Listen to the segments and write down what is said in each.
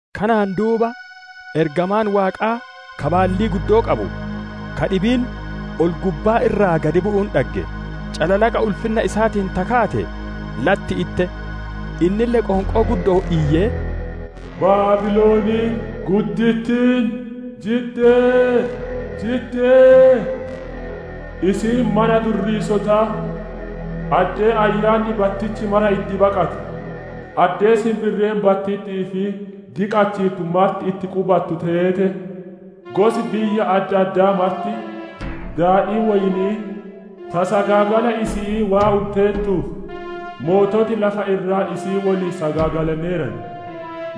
Kanaan duuba ergamaan Waaqaa ka baallii guddoo qabu ka dhibiin ol-gubbaa irraa gadi bu'uun dhagge; calalaqa ulfinna isaatiin ta kaate latti itte. Innille qoonqoo guddo'oon iyyee: «Baabiloniin guddittiin jidde! Jidde! Isiin mana durriisotaa, addee ayyaanni battichi mara itti baqatu, addee sinbirreen battitti'ii fi diqachiittu marti itti qubatu teete! Gosi biyya adda addaa marti, daadhii woyni'ii ta sagaagala isi'ii waan unteertuuf, moototi lafa irraa isii woliin sagaagalaneeran;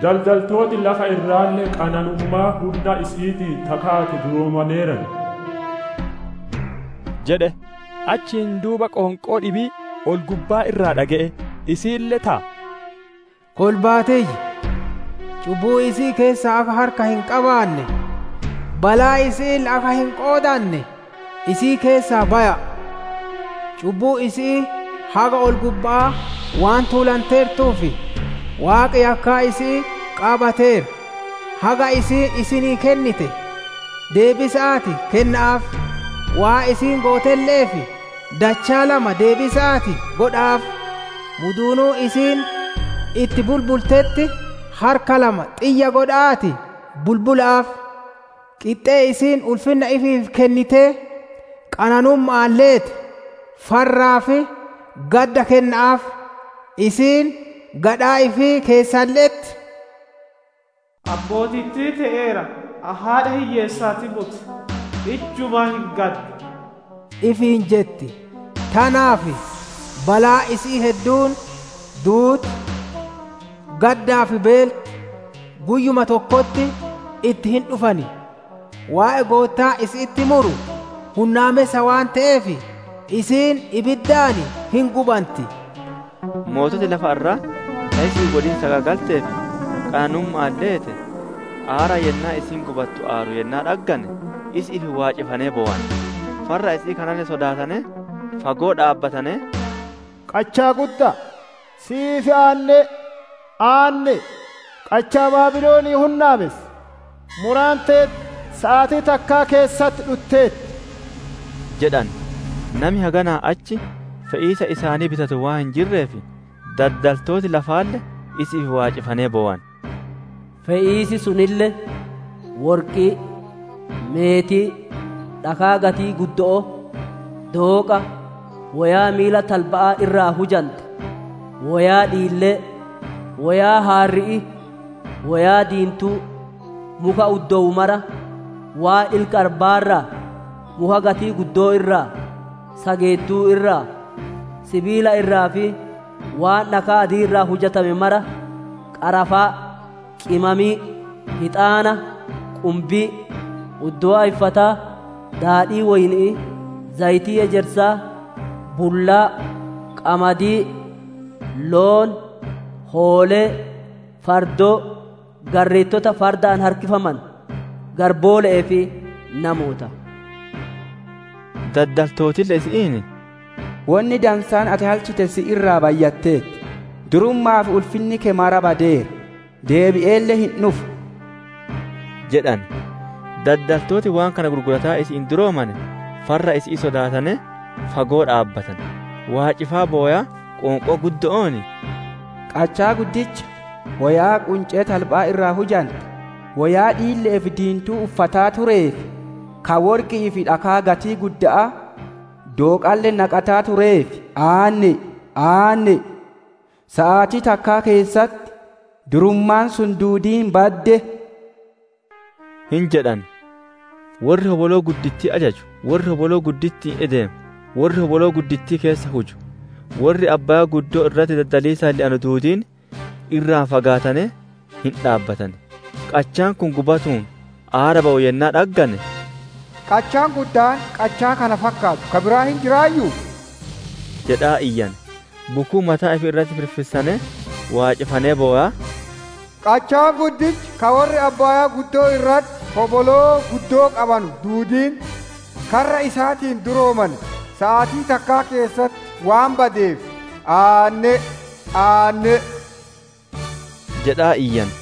daddaltooti lafa irraalle qananummaa hunna isi'iitiin ta kaate duroomaneeran» jedhe. Achiin duuba qoonqoo dhibii ol-gubbaa irraa dhage'e; isiille: « ‹Kolbaa tiyya! Cubbuu isi'ii keessaa akka harka hin qabaanne, balaa isi'iille akka hin qoodanne, isii keessaa baya'a! Cubbuun isi'ii haga ol-gubba'aa waan tuulanteertuuf, Waaqi yakkaa isi'ii qaabateera. Haga isiin isinii kennite, deebisa'aatii kenna'aaf, waan isiin gootelle'eef dachaa lama deebisa'aatii godha'aaf! Muduunuu isiin itti bulbultetti, harka lama xiyya godha'aatii bulbula'aaf! Qixxee isiin ulfinna ifiif kennitee, qanannumma'aan leete, farraa fi gadda kenna'aaf. Isiin gadhaa ifii keessalle'etti, ‹Ani mootittii te'eera; ani haadha hiyyeessaatii moti; ijjumaa hin gaddu› ifiin jetti. Tanaaf balaan isi'ii hedduun: duuti, gaddaa fi beelti, guyyuma tokkotti itti hin dhufan. Waaqi Goottaan isi'itti muru hunnaamessa waan te'eef isiin ibiddaan hin gubanti. «Moototi lafa irraa ta isii woliin sagaagaltee fi qananumma'aan leete, aara yennaa isiin gubattu aaru yennaa dhaggane, isi'iif waacifanee bowan. Farra isi'ii kanalle sodaatanee, fagoo dhaabbatanee, ‹Qachaa gudda'a, si'iif aanne'e! Aanne'e! Qachaa Baabilonii hunnaamessa, muraan teeti saatii takkaa keessatti dhutteerti› jedhan. «Nami haganaa achi fe'iisa isaanii bitatu waan hin jirreef, daddaltooti lafaalle isi'iif waacifanee bowan. Fe'iis sunille: Worqii, meetii, dhakaa gatii guddo'oo, dooqa, woyaa miila talba'aa irraa hujante, woyaa dhiillee, woyaa haarri'ii, woyaa diintuu, muka uddowu mara, waan ilka arbaa irraa, muka gatii guddo'oo irraa, sageettuu irraa, sibiila irraa fi waan dhakaa adii irraa hujame mara, qarafaa, qimamii, hixaana, qumbii, uddowaa iffataa, daadhii woyni'ii, zayitii ejersaa, bullaa, qamadii, loon, hoolee, fardoo, garreettota fardaan harkifamanu, garboole'ee fi namoota. «Daldaltootille isi'iin, ‹Wonni dansaan ati halchite si irraa bayyatteerti; durumma'aa fi ulfinni keeti mara badeera; deebi'eelle hin dhufu› jedhan. Daddaltooti waan kana gurgurataa isi'iin duroomane farra isi'ii sodaatanee fagoo dhaabbatan; waacifaa bowaa, qoonqoo guddo'oon iyyaa: « ‹Qachaa guddicha, woyaa quncee talba'aa irraa hujante, woyaa dhiille'ee fi diintuu uffataa tureef, ka worqi'ii fi dhakaa gatii gudda'aa, dooqalle naqataa tureef aanne'e! Aanne'e! Saatii takkaa keessatti durummaan sun duudiin badde!› hin jedhan. « ‹Worri hoboloo guddittii ajaju, worri hoboloo gudditti'iin ideemu, worri hoboloo guddittii keessa huju, worri abbaayaa irratti daddaliisaan le'anu duudiin irraa fagaatanee hin dhaabbatan. Qachaan kun gubatuun aara bawu yennaa dhaggane, «Qachaan guddaan qachaa kana fakkaatu ka biraa hin jiraayyuu?» jedhan. Bukuu mataa ifii irratti firfirsanee, waacifaa bowaa, « ‹Qachaan guddichi ka worri abbaayaa irratti hoboloo guddittii qabanu duudiin, karra isaatiin duroomane, saatii takkaa keessatti waan badeef aanne'e! Aanne'e!› jedhaa iyyan.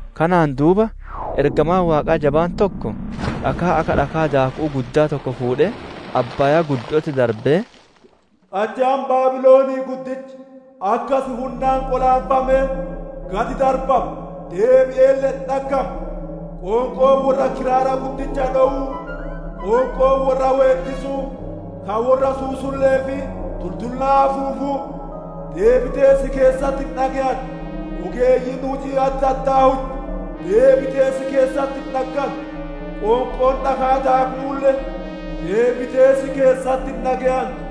Kanaan duuba ergamaan Waaqaa jabaan tokko dhakaa akka dhakaa daaku'uu guddaa tokko fuudhee abbaaya'atti darbee: «Qachaan Baabilonii guddichi akkas hunnaan qolaanfamee, gad darbama, deebi'eelle hin dhaggamu! Qoonqoon worra kiraara guddicha dhowuu, qoonqoon worra weeddisuu, ka worra susulle'ee fi tultullaa afuufuu, deebitee si keessatti hin dhage'antu. Ogeeyyiin hujii adda addaa hujju, deebitee si keessatti hin dhaggantu. Qoonqoon dhakaa daaku'uulle, deebitee si keessatti hin dhage'antu.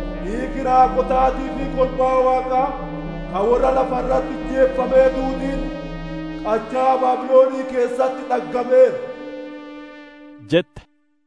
Dhiigi raagotaatii fi kolbaa Waaqaa, ka worra lafa irratti ijjeefamee duudiin, qachaa Baabilonii keessatti dhaggameera» jette.